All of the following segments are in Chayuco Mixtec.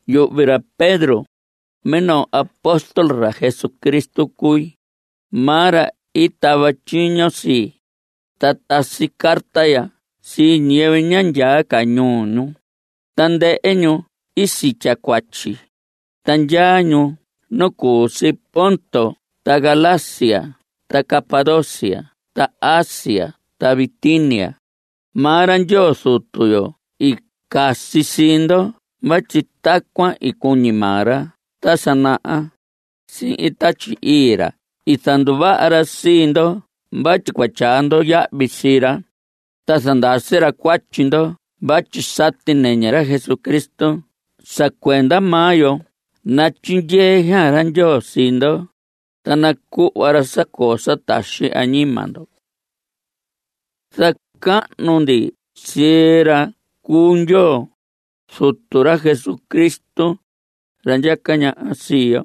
Yuhvi ra Pedro, minoo apóstol ra Jesucristo cui. Maa ra i tava tyiño sii. Ta tasi carta ya sii ñiyɨvɨ ña ndyaa ca ñuu ñu. Tandɨhɨ ñu i sitya cuatyi. Ta ndyaa ñu nu cu si Ponto ta Galacia ta Capadocia ta Asia ta Bitinia. Maa ra Ndyoo Zutu yo i casi sii ndo vatyi tacuan i cuñi maa ra ta sa naha. Sihin Tatyi Ii ra i zanduvaha ra sii ndo vatyi cua tyaa ndo yahvi sii ra, ta zandasi ra cuatyi ndo vatyi sati nɨñɨ ra Jesucristo sa cuenda maa yo. Natyindyee xaan ra Ndyoo sii ndo, ta nacuhva ra sa coo sa taxi añima ndo. Zacahnu ndi sii ra cu Ndyoo, Zutu ra Jesucristo, ra ndyaca ñaha sii yo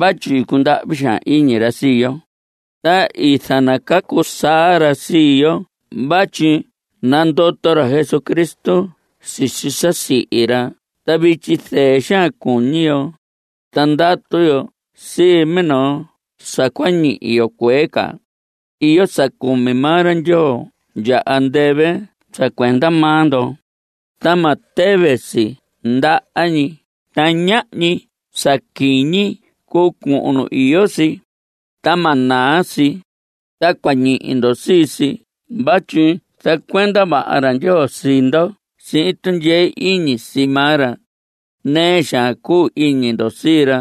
vatyi i cundahvi xaan iñi ra sii yo, ta i zanacacu saa ra sii yo vatyi i nandoto ra Jesucristo sisi sa i sihi ra. Ta vityi zɨɨ xaan cuñi yo, ta ndatu yo sii minoo sa cua ñihi yo cuee ca. Iyo sa cumi maa ra Ndyoo ndya andɨvɨ sa cuenda maa ndo, ta ma tɨvɨ si ndaha ñi, ta ñahñi sa quiñi cuu cuhun nu iyo si, ta ma naa si. Ta cua ñihi ndo sii si vatyi zacuenda vaha ra Ndyoo sii ndo sihin tundyee iñi sii maa ra. Nɨɨ xaan cuu iñi ndo sii ra,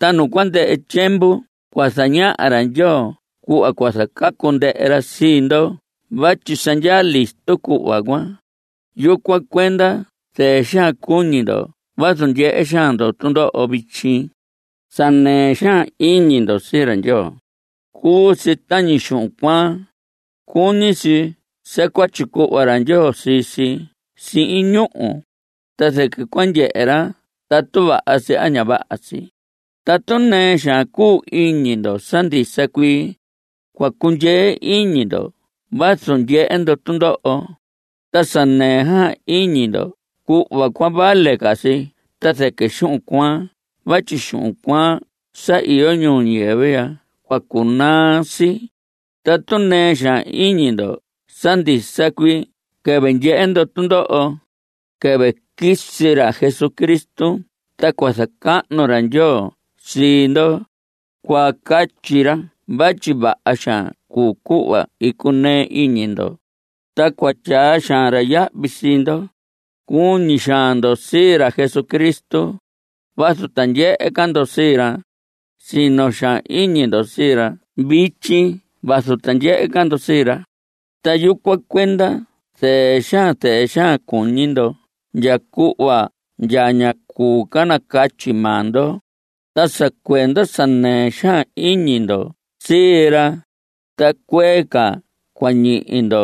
ta nu cua ndɨhɨ tyiemvu cua zañaha ra Ndyoo cuhva cua zacacu ndɨhɨ ra sii ndo vatyi sa ndyaa listo cuhva cuan. Yucuan cuenda zɨɨ xaan cuñi ndo vazu ndyehe xaan ndo tundoho vityi. Sa nɨɨ xaan iñi ndo sii ra Ndyoo, cuu si tañi xuhun cuaan. Cuñi si sa cua tyicuhva ra Ndyoo sii si sihin ñúhu, ta zɨquɨ cua ndyehe ra tatu vaha si a ña vaha si. Tatu nɨɨ xaan cuu iñi ndo sa ndisa cuii, cua cundyee iñi ndo vazu ndyehe ndo tundoho, ta sa nɨɨ xaan iñi ndo cuhva cuan vale ca si ta zɨquɨ xuhun cuaan vatyi xuhun cuaan sa iyo ñuu ñiyɨvɨ ya cua cunaa si. Tatu nɨɨ xaan iñi ndo sa ndisa cuii quɨvɨ ndyehe ndo tundoho, quɨvɨ quisi ra Jesucristo ta cua zacahnu ra Ndyoo sii ndo. Cua catyi ra vatyi vaha xaan cuu cuhva i cunɨɨ iñi ndo, ta cua tyaa xaan ra yahvi sii ndo. Cuñi xaan ndo sii ra Jesucristo vazu ta ndyehe ca ndo sii ra. Sino xaan iñi ndo sii ra vityi vazu ta ndyehe ca ndo sii ra, ta yucuan cuenda zɨɨ xaan zɨɨ xaan cuñi ndo ndya cuhva ndya ña cuu ca nacatyi maa ndo. Ta sa cuenda sa nɨɨ xaan iñi ndo sii ra, ta cuee ca cua ñihi ndo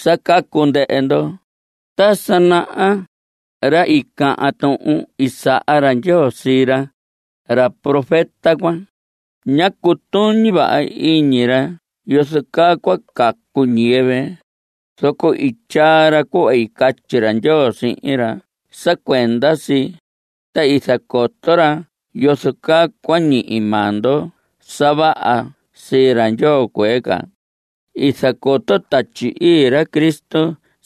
sa cacu ndɨhɨ ndo. Ta sa naha, ra i cahan tuhun i saha ra Ndyoo sii ra, ra profeta cuan, ñá cutuñi vaha iñi ra yozo caa cua cacu ñiyɨvɨ, zoco i tyaa ra cuhva i catyi ra Ndyoo sihin ra sa cuenda si, ta i zacoto ra yozo caa cua ñihi maa ndo sa vaha sii ra Ndyoo cuee ca. I zacoto Tatyi Ii ra Cristo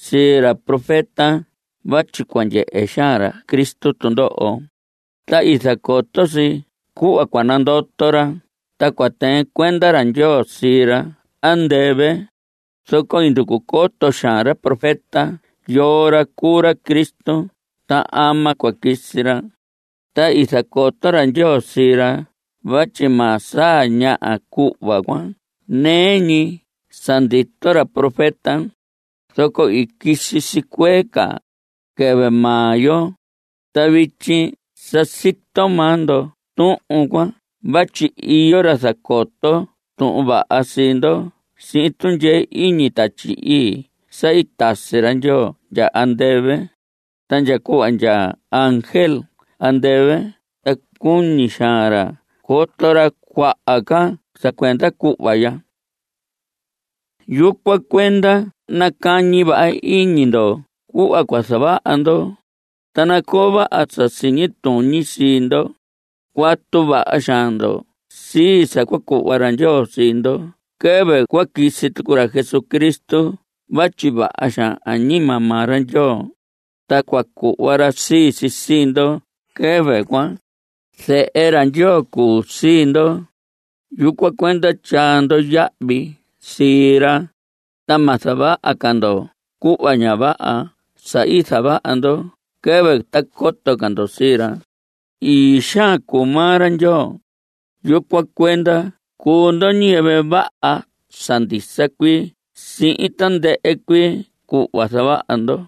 sii ra profeta vatyi cua ndyehe xaan ra Cristo tundoho, ta i zacoto si cuhva cua nandoto ra ta cua tɨɨn cuenda ra Ndyoo sii ra andɨvɨ, zoco i nducu coto xaan ra profeta yoo ra cuu ra Cristo ta ama cua quisi ra. Ta i zacoto ra Ndyoo sii ra vatyi ma saa ñaha cuhva cuan nɨɨ ñi sa ndito ra profeta, zoco i quisi si cuee ca, quɨvɨ maa yo. Ta vityi sa sito maa ndo tuhun cuan vatyi iyo ra zacoto Tuhun Vaha sii ndo sihin tundyee iñi Tatyi Ii sa i tasi ra Ndyoo ndya andɨvɨ. Ta ndya cuhva ndya ángel andɨvɨ ta cuñi xaan ra coto ra cuaha ca sa cuenda cuhva ya. Yucuan cuenda nacañi vaha iñi ndo cuhva cua zavaha ndo, ta nacoo vaha sa siñi tuñi sii ndo. Cuatu vaha xaan ndo sii sa cua cuhva ra Ndyoo sii ndo quɨvɨ cua quisi tucu ra Jesucristo vatyi vaha xaan añima maa ra Ndyoo, ta cua cuhva ra sii si sii ndo quɨvɨ cuan. Zehe ra Ndyoo cuu sii ndo. Yucuan cuenda tyaa ndo yahvi sii ra, ta ma zavaha ca ndo cuhva ña vaha sa i zavaha ndo quɨvɨ ta coto ca ndo sii ra. Ii xaan cuu maa ra Ndyoo, yucuan cuenda cuu ndo ñiyɨvɨ vaha sa ndisa cuii sihin tandɨhɨ cuii cuhva zavaha ndo.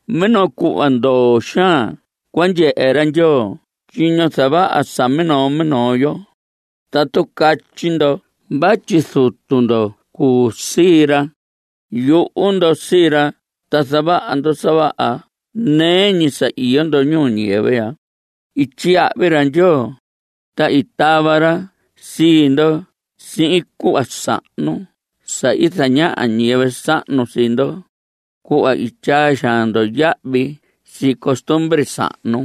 Minoo cuhva ndoo xaan cua ndyehe ra Ndyoo tyiño zavaha sa minoo minoo yo. Tatu catyi ndo vatyi Zutu ndo cuu sii ra, yuhu ndo sii ra ta zavaha ndo sa vaha nɨɨ ñi sa iyo ndo ñuu ñiyɨvɨ ya. I tyiyahvi ra Ndyoo, ta i tava ra sii ndo sii cuhva sahnu sa i zañaha ñiyɨvɨ sahnu sii ndo, cuhva i tyaa xaan ndo yahvi sii costumbre sahnu.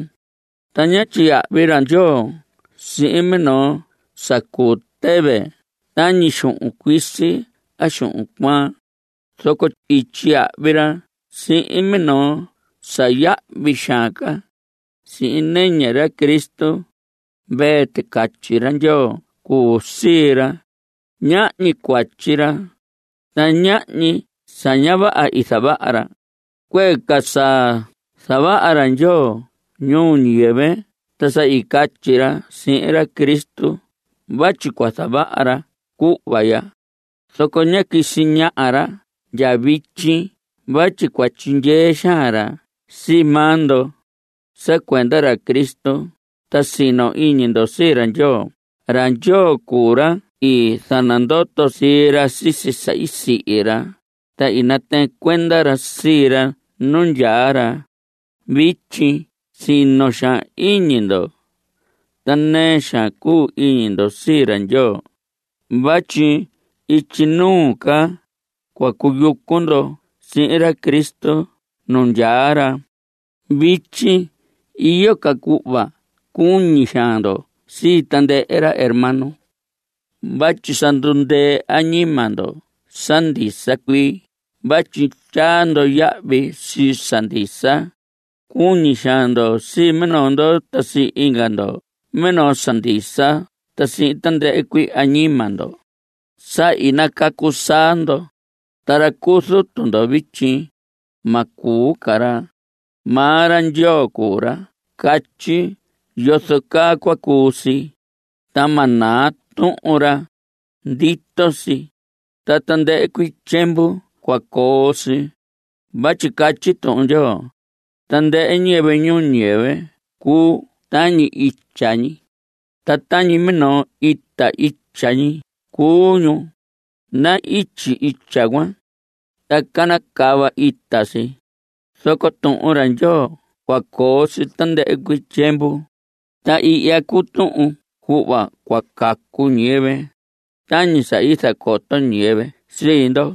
Ta ñá tyiyahvi ra Ndyoo sihin minoo sa cuu tɨvɨ tañi xuhun cuisi a xuhun cuaan. Zoco i tyiyahvi ra sihin minoo sa yahvi xaan ca, sihin nɨñɨ ra Cristo. Mvee ticatyi ra Ndyoo cuu sii ra. Ñahñi cuatyi ra, ta ñahni sa ña vaha i zavaha ra. Cuee ca sa zavaha ra Ndyoo ñuu ñiyɨvɨ ta sa i catyi ra sihin ra Cristo vatyi cua zavaha ra cuhva ya, zoco ñá quisi ñaha ra ndya vityi vatyi cua tyindyee xaan ra sii maa ndo. Sa cuenda ra Cristo, ta sino iñi ndo sii ra Ndyoo. Ra Ndyoo cuu ra i zanandoto sii ra sisi sa i sihi ra, ta i natɨɨn cuenda ra sii ra nu ndyaa ra. Vityi sino xaan iñi ndo ta nɨɨ xaan cuu iñi ndo sii ra Ndyoo vatyi ityi nuu ca cua cuyucu ndo sihin ra Cristo nu ndyaa ra. Vityi iyo ca cuhva cuñi xaan ndo sii tandɨhɨ ra hermano vatyi sa ndundɨɨ añima ndo sa ndisa cuii vatyi tyaa ndo yahvi sii sa ndisa. Cuñi xaan ndo sii minoo ndo ta sii inga ndo minoo sa ndisa ta sihin tandɨhɨ cuii añima ndo. Sa i nacacu saa ndo. Ta ra cuu Zutu ndo vityi, ma cuu ca ra. Maa ra Ndyoo cuu ra catyi yozo caa cua cuu si. Ta ma naa tuhun ra. Ndito si, ta tandɨhɨ cuii tyiemvu cua coo si. Vatyi catyi Tuhun Ndyoo: Tandɨhɨ ñiyɨvɨ ñuu ñiyɨvɨ cuu tañi itya ñi, ta tañi minoo ita itya ñi cuu ñu. Na‑ityi itya cuan, ta canacava ita si, zoco Tuhun ra Ndyoo cua coo si tandɨhɨ cuii tyiemvu. Ta ihya cuu tuhun cuhva cua cacu ñiyɨvɨ, tañi sa i zacoto ñiyɨvɨ sii ndo.